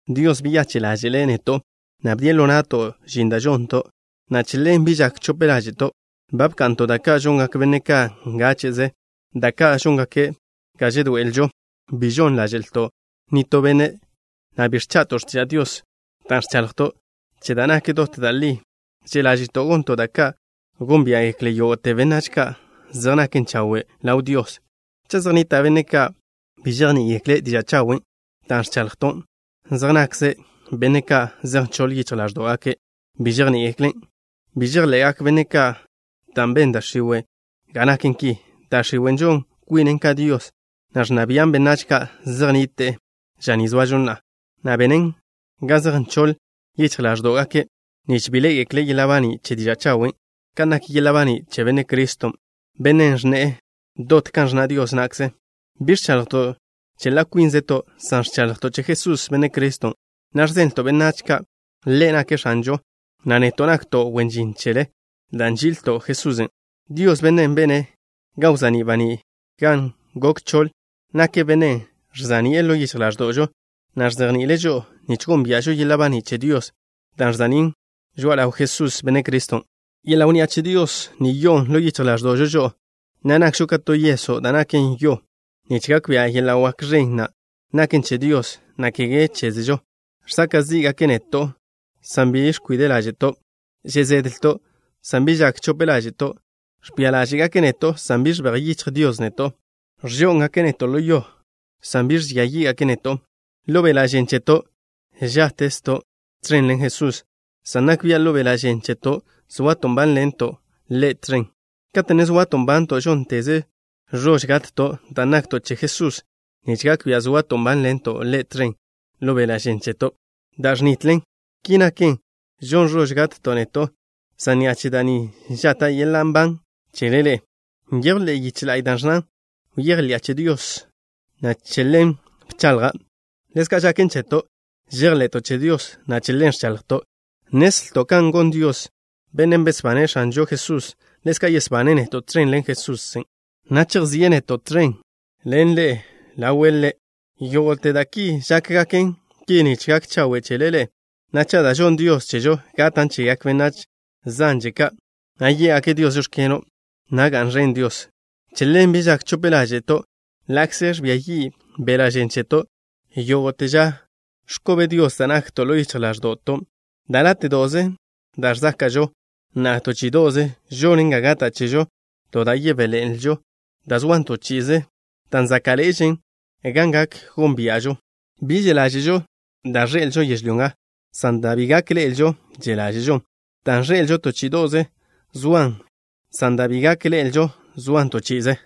Dios beyache' ḻáže'le' neto', na' bdie' ḻo na'to' žin da' žonto', na' che ḻen bi žak chope ḻáže'to'. Ba bka'nto' da' ka' žongak benne' ka' ngáche'ze, da' ka' žóngaken ga žedoe'elžo. Bi žon ḻáže'lto' nitó benne', na' bi ẕcha'to' x̱tiža' Dios. Dan' ẕchaḻjto' che da' nak dot da' li, že' ḻáže'to' gonto' da' ka' gónbia'gekle yógo'te benách ka' zej naken chawe' ḻaw Dios. Cha' zej nnita' benne' ka' bi žejní'igekle' diža' chawen' da' ẕchaḻjto', zej nakze benne' ka' zej nchoḻ yichj ḻáẕdo'gake' bi žejní'igeklen'. Bi žejḻe'gak benne' ka', dan' ben da' x̱iwe' ga naken ki. Da' x̱iwe' žon kwinen ka dios, na' ẕnna bian' benách ka' zej nnite'e ža ni zoažo na'a, na' benen ga zej nchoḻ yichj ḻáẕdo'gake' nich bi ḻé'egekle' yeḻa' baní' che diža' chawen' kan nak yeḻa' baní' che Benne' Criston', Bennen' ẕnne'e dot kan ẕnna' Dios na'kze. Bi ẕchaḻjto' che ḻa' kwínzeto', san ẕchaḻjto' che Jesús, Benne' Criston', na' ẕzenlto' benách ka' Ḻe' nake' X̱anžo, na' neto' nakto' wen žin chele dan' nži'ilto' Jesusen'. Dios, Bennen' bene' ga wza'ní' baní' gan gok choḻ, nake' Bennen' žsa'ni'e ḻo yichj ḻáẕdo'žo, na' ẕzejni'ile' žo'o nich gónbia'žo yeḻa' baní' che Dios, da' ẕza'nín' žoa'a ḻaw Jesús, Benne' Criston'. Yeḻa' wnni'a che Dios ni yo'on ḻo yichj ḻáẕdo'žo žo'o, na' nakžo ka to yeso' da' naken yo, nich gak bia' yeḻa' wak ẕen na' naken che Dios, na' kege chézežo. Žsaka' zí'gake' neto', san bi ẕkwide' ḻáže'to'. Že' zedlto', san bi žak chope ḻáže'to'. Ẕbia ḻáže'gake' neto', san bi žebéj yichj Dios neto'. Ẕžó'ngake' neto' ḻo yo, san bi ẕbía yí'gake' neto'. Ḻo beḻa' žen cheto' žáttezto' tẕen ḻen Jesús, san nak bia' ḻo beḻa' žen cheto' zoato' nbánḻento' Ḻe' tẕen. Kate' ne zoato' nbanto', žónteze ẕož gatto' dan' nakto' che Jesusen' nich gak bia' zoato' nbánḻento' Ḻe' tẕen ḻo beḻa' žen cheto', da' ẕnitlen. Ki naken, žon ẕož gatto' neto', san ni'a che da' ni žata' yeḻa' nban chele ḻe'e. Nyejw ḻe'e yiche la'y da' ẕnnan: “Bejḻi'a che Dios, na' che ḻen bchaḻja'.” Ḻezka' žaken cheto', žejḻe'to' che Dios, na' che ḻen ẕchaḻjto'. Nnezlto' kan gon Dios, Bennen' besbane' X̱anžo Jesús, ḻezka' yesbane' neto' tẕen ḻen Jesusen', na' chejzíe' neto' tẕen ḻen ḻe'e ḻawe' Ḻe'. Yógo'te da' ki žákgaken ki nich gak chawe' chele ḻe'e, na' cha' da' žonn Dios chežo gatan' chegak benách zanže ka', na' yé'gake' Dios: “Žóx̱keno'” na' ga'n ẕen Dios. Che ḻen, bi žak chope ḻáže'to'. Ḻa'kze ẕbia yi' beḻa' žen cheto', yógo'te ža ẕkobe Dios da' nakto' ḻo yichj ḻáẕdo'to'. Da' láte'do'ze da' ẕzáka'žo na'a to chí'ido'ze žonen ga gata' chežo to da' yebéḻe'eḻenlžo da' soan to chi'ize, dan' záka'ḻe'ežen kan gak gónbia'žo. Bi že' ḻáže'žo da' ẕḻe'elžo yežlyó nga, san da' bi gak ḻe'elžo že' ḻáže'žon. Dan' ẕḻe'elžo, to chí'ido'ze zoan, san dan' bi gak ḻe'elžo soan to chi'ize.